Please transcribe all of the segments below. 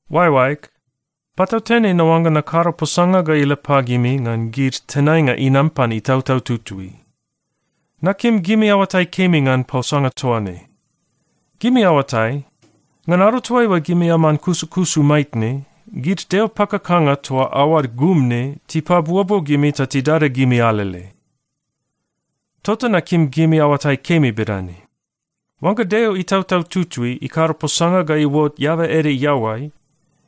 Oaeoaeg, patautene naoangga nakado posanga ga ila pagimi ngan gid tenainga inam pan Itautau Tutui. Nakim gimi aoatai kemi ngan posanga toa ne. Gimi aoatai, ngan ado toaiua gimi aman kusukusu maitne, gid deo pakakanga toa aoad gum ne tipabuobuo gimi ta tidada gimi alele. Tota nakim gimi aoatai kemi bedane: Oangga Deo Itautau Tutui ikado posanga ga iuot eaba ede iaoai,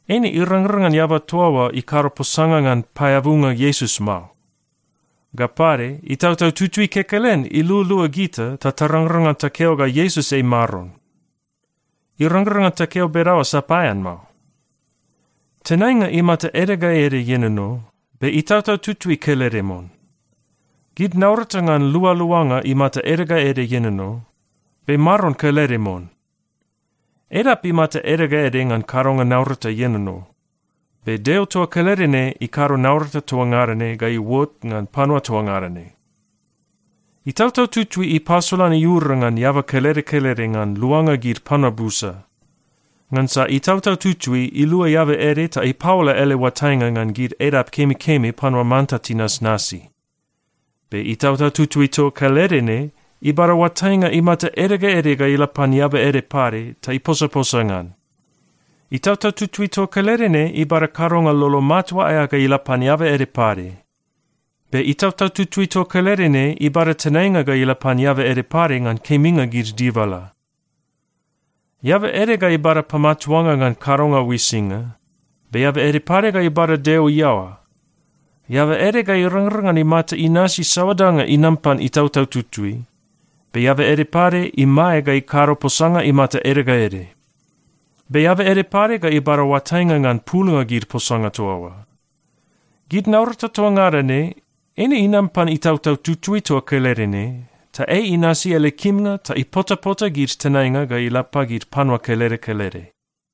eine irangrang ngan eaba toa oa ikado posanga ngan paeabunga Iesus mao. Ga pade, Itautau Tutui kekelen ilualua gita ta tarangrang ngan takeo ga Iesus ei Maron. Irangrang ngan takeo bedaoa sapaean mao. Tenainga imata ede ga ede ienono, be Itautau Tutui kelede mon. Gid naurata ngan lualuanga imata ede ga ede ienono, be Maron kelede mon. Edap imata ede ga ede ngan kadonga naurata ienono, be Deo toa kelede ne ikado naurata toa ngada ne ga iuot ngan panua toa ngada ne. Itautau Tutui ipasolan iura ngan eaba kelede kelede ngan luanga gid panua busa. Ngansa Itautau Tutui ilua eaba ede ta ipaola ele oatainga ngan gid edap kemikemi panua manta tinasnasi. Be Itautau Tutui toa kelede ne ibada oatainga imata ede ga ede ga ila pan eaba ede pade ta iposaposa ngan. Itautau Tutui toa kelede ne ibada kadonga lolo matua aea ga ila pan eaba ede pade. Be Itautau Tutui toa kelede ne ibada tenainga ga ila pan eaba ede pade ngan keminga gid dibala. Eaba ede ga ibada pamatuanga ngan kadonga uisinga, be eaba ede pade ga ibada Deo iaoa. Eaba ede ga irangrang ngan imata inasi saoa danga inam pan Itautau Tutui, be eaba ede pade imae ga ikado posanga imata ede ga ede. Be eaba ede pade ga ibada oatainga ngan pulnga gid posanga toa oa. Gid naurata toa ngada ne eine inam pan Itautau Tutui toa kelede ne, ta ei inasi ele kimnga ta ipotapota gid tenainga ga ila pagid panua kelede kelede.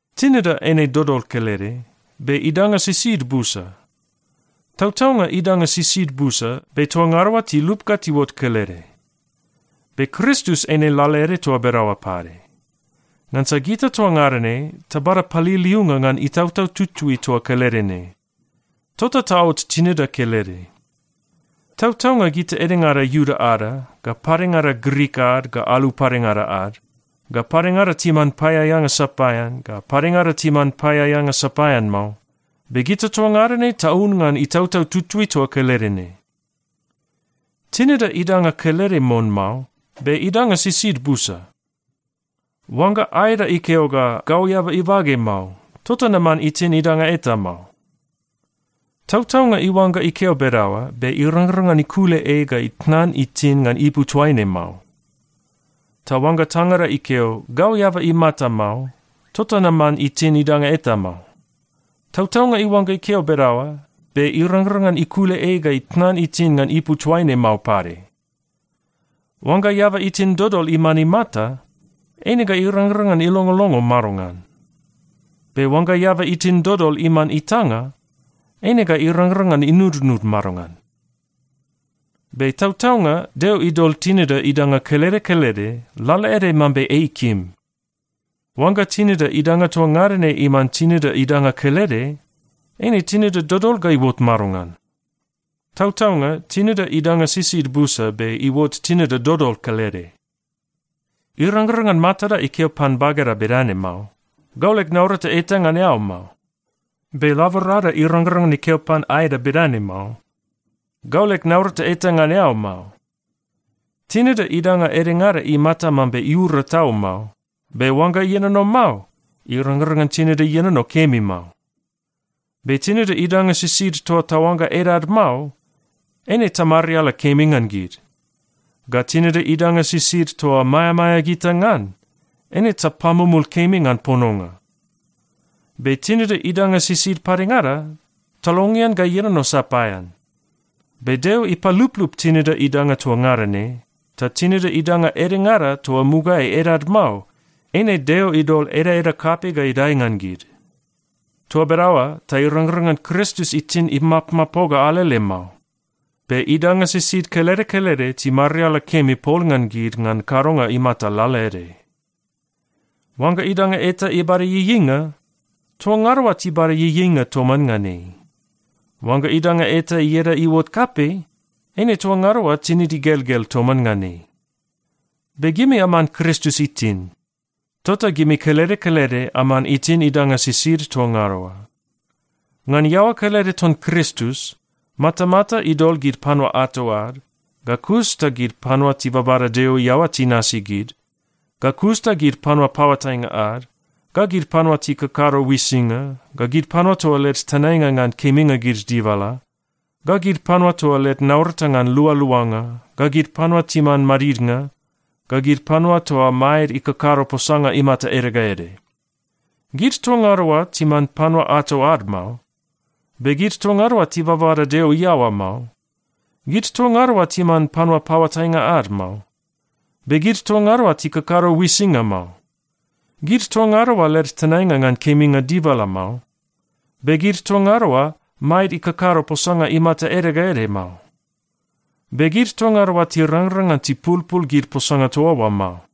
Tinida eine dodol kelede, be idanga sisid busa. Tautaunga idanga sisid busa, be toa ngada oa tilup ga tiuot kelede. Be Kristus eine lalaede toa bedaoa pade. Ngansa gita toa ngada ne tabada paliliunga ngan Itautau Tutui toa kelede ne, tota taot tinida kelede. Tautaunga gita edengada Iuda ada, ga padengada Grik ad ga alu padengada ad, ga padengada timan paeaeanga sapaean, ga padengada timan paeaeanga sapaean mao, be gita toa ngada ne taun ngan Itautau Tutui toa kelede ne. Tinida idanga kelede mon mao, be idanga sisid busa. Oangga aeda ikeo ga, “Gau eaba ibage mao, tota naman itin idanga eta mao.” Tautaunga iuangga ikeo bedaoa, be irangrang ngan ikule ei ga itnan itin ngan ipu toaine mao. Ta oangga tangada ikeo, “Gau eaba imata mao, tota naman itin idanga eta mao.” Tautaunga iuangga ikeo bedaoa, be irangrang ngan ikule ei ga itnan itin ngan ipu toaine mao pade. Oangga eaba itin dodol iman imata, eine ga irangrang ngan ilongolongo madongan? Be oangga eaba itin dodol iman itanga, eine ga irangrang ngan inudnud madongan? Be tautaunga Deo idol tinida idanga kelede kelede lalaede mambe ei ikim. Oangga tinida idanga toa ngada ne iman tinida idanga kelede, eine tinida dodol ga iuot madongan? Tautaunga, tinida idanga sisid busa be iuot tinida dodol kelede. Irangrang ngan matada ikeo pan bageda bedane mao, “Gau leg naurata eta ngan eao mao.” Be laborada irangrang ngan ikeo pan aeda bedane mao, “Gau leg naurata eta ngan eao mao.” Tinida idanga edengada imata mambe iura tau mao, be oangga ienono mao, irangrang ngan tinida ienono kemi mao. Be tinida idanga sisid toa taoangga edad mao, eine tamariala kemi ngan gid. Ga tinida idanga sisid toa maeamaea gita ngan, eine tapamumul kemi ngan pononga. Be tinida idanga sisid padengada, talongean ga ienono sapaean. Be Deo ipaluplup tinida idanga toa ngada ne, ta tinida idanga edengada toa mugaeai edad mao, eine Deo idol edaeda kapei ga idae ngan gid. Toa bedaoa ta irangrang ngan Kristus itin imapmapoga alele mao, be idanga sisid kelede kelede timariala kemi pol ngan gid ngan kadonga imata lalaede. Oangga idanga eta ibada ieieinga, toa ngada oa tibada ieieinga toman ngan ei. Oangga idanga eta ieda iuot kapei, eine toa ngada oa tinid igelgel toman ngan ei. Be gimi aman Kristus itin. Tota gimi kelede kelede aman itin idanga sisid toa ngada oa. Ngan iaoa kelede ton Kristus, matamata idol gid panua ato ad, ga kus ta gid panua tibabada Deo iaoa tinasi gid, ga kus ta gid panua paoatainga ad, ga gid panua tikakado uisinga, ga gid panua toa led tenainga ngan keminga gid dibala, ga gid panua toa led naurata ngan lualuanga, ga gid panua timan madidnga, ga gid panua toa maed ikakado posanga imata ede ga ede. Gid toa ngada oa timan panua ato ad mao. Be gid toa ngada oa tibabada Deo iaoa mao. Gid toa ngada oa timan panua paoatainga ad mao. Be gid toa ngada oa tikakado uisinga mao. Gid toa ngada oa led tenainga ngan keminga dibala mao. Be gid toa ngada oa, maed ikakado posanga imata ede ga ede mao. Be gid toa ngada oa tirangrang ngan tipulpul gid posanga toa oa mao.